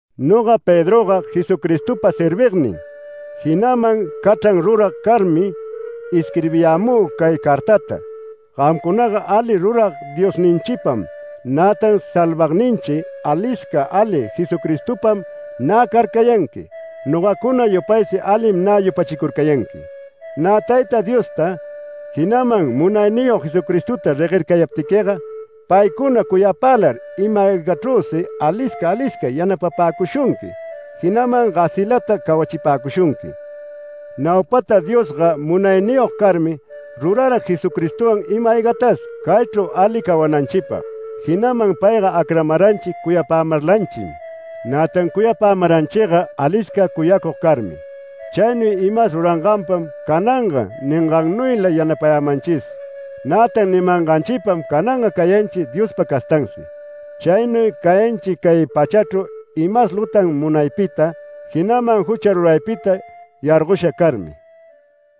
Noga Pedroga Jesucristopa servignin, jinaman cachran rurag carmi, isquirbiyämü cay cartata. Gamcunaga ali rurag Diosninchipam, nätan salvagninchi alisca ali Jesucristopam nä carcayanqui, nogacuna yupaysi alim nä yupachicurcayanqui. Nä Tayta Diosta, jinaman Munayniyog Jesucristota reguercayaptiquiga, paycuna cuyapälar ima-aygachrüsi alisca alisca yanapapäcushunqui, jinaman gasilata cawachipäcushunqui. Naupata Diosga munayniyog carmi, rurara Jesucristowan ima-aygatas caychru ali cawananchipag, jinaman payga acramaranchi cuyapämarlanchim. Nätan cuyapämaranchiga alisca cuyacug carmi. Chaynuy imas ruranganpam cananga ningannuyla yanapayämanchis, nätan nimanganchipam cananga cayanchi Diospa castansi. Chaynuy cayanchi cay pachachru imas lutan munaypita, jinaman jucha ruraypita yargosha carmi.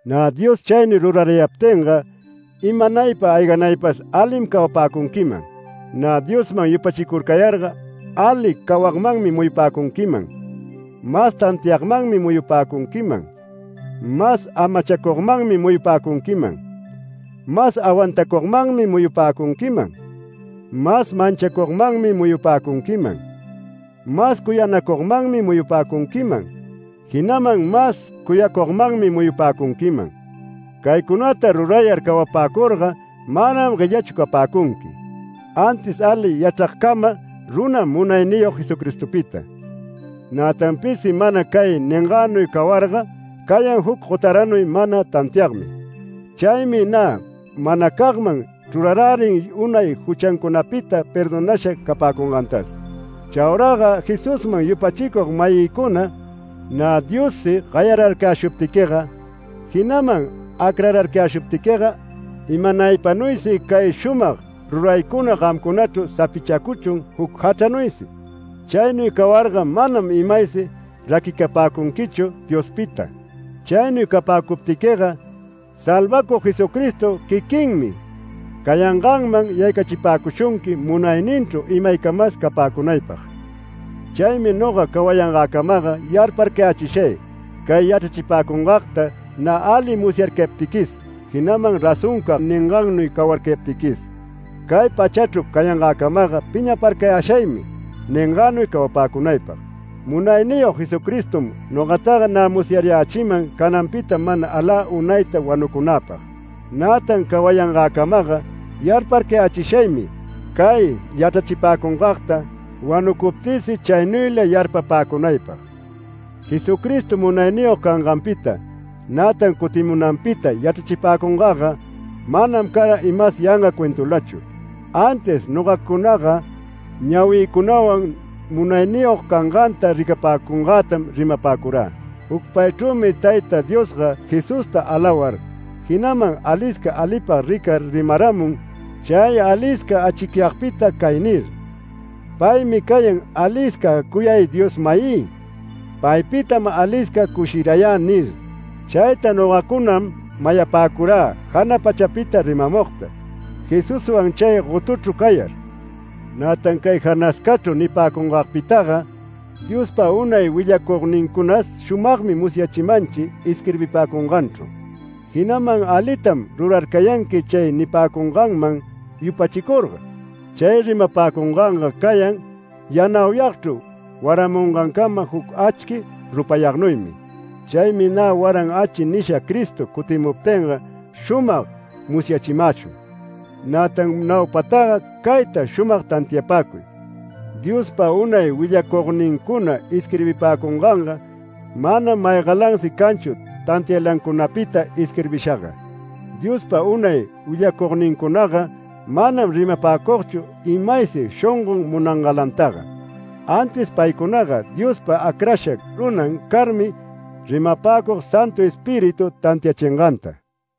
Nä Dios chaynuy rurarayaptinga imanaypa ayganaypas alim cawapäcunquiman. Nä Diosman yupachicurcayarga ali cawagmanmi muyupäcunquiman, mas tantiagmanmi muyupäcunquiman, mas amachacugmanmi muyupäcunquiman, mas awantacugmanmi muyupäcunquiman, mas manchacugmanmi muyupäcunquiman, mas cuyanacugmanmi muyupäcunquiman, jinaman mas cuyacugmanmi muyupäcunquiman. Caycunata rurayar cawapäcurga manam guellachu capäcunqui, antis ali yachragcama runam Munayniyog Jesucristopita. Nätan pisi mana cay ningänuy cawarga cayan juc gotaranuy mana tantiagmi. Chaymi nä manacagman chrurarärin unay juchancunapita perdonasha capäcungantas. Chauraga Jesusman yupachicug-mayïcuna, nä Diossi gayararcayäshuptiquiga, jinaman acrararcayäshuptiquiga imanaypanuysi cay shumag ruraycuna gamcunachru sapichacuchun juc jachranuysi. Chaynuy cawarga manam imaysi raquicapäcunquichu Diospita. Chaynuy capäcuptiquiga, Salvacug Jesucristo quiquinmi cayanganman yaycachipäcushunqui munayninchru imaycamas capäcunaypag. Chaymi noga cawayangäcamaga yarparcayächishay, cay yachrachipäcungagta nä ali musyarcayaptiquis, jinaman razoncag ningannuy cawarcayaptiquis. Cay pachachru cayangäcamaga piñaparcayäshaymi ningänuy cawapäcunaypag. Munayniyog Jesucristom nogataga nä musyarayächiman cananpita mana alä unayta wanucunäpag. Nätan cawayangäcamaga yarparcayächishaymi cay yachrachipäcungagta wanucuptïsi chaynuyla yarpapäcunaypag. Jesucristo munayniyog canganpita, nätan cutimunanpita yachrachipäcungagga manam cara imas yanga cuentulachu, antis nogacunaga ñawïcunawan munayniyog canganta ricapäcungätam rimapäcurä. Jucpaychrümi Tayta Diosga Jesusta alawar, jinaman alisca alipag ricar rimaramun chay alisca achicyagpita cay nir: “Paymi cayan alisca cuyay Dios-mayï. Paypitam alisca cushirayä” nir. Chayta nogacunam mayapäcurä jana pachapita rimamugta, Jesuswan chay gotuchru cayar. Nätan cay janascachru nipäcungagpitaga, Diospa unay willacugnincunas shumagmi musyachimanchi isquirbipäcunganchru. Jinaman alitam rurarcayanqui chay nipäcunganman yupachicurga. Chay rimapäcunganga cayan yanauyagchru waramungancama juc achqui rupayagnuymi. Chaymi nä ‘waran achi’ nisha Cristo cutimuptinga shumag musyachimäshun. Nätan naupataga cayta shumag tantiapäcuy: Diospa unay willacugnincuna isquirbipäcunganga manam maygalansi canchu tantiaylancunapita isquirbishaga. Diospa unay willacugnincunaga manam rimapäcugchu imaysi shongon munangalantaga, antis paycunaga Diospa acrasha runan carmi rimapäcug Santu Espíritu tantiachinganta.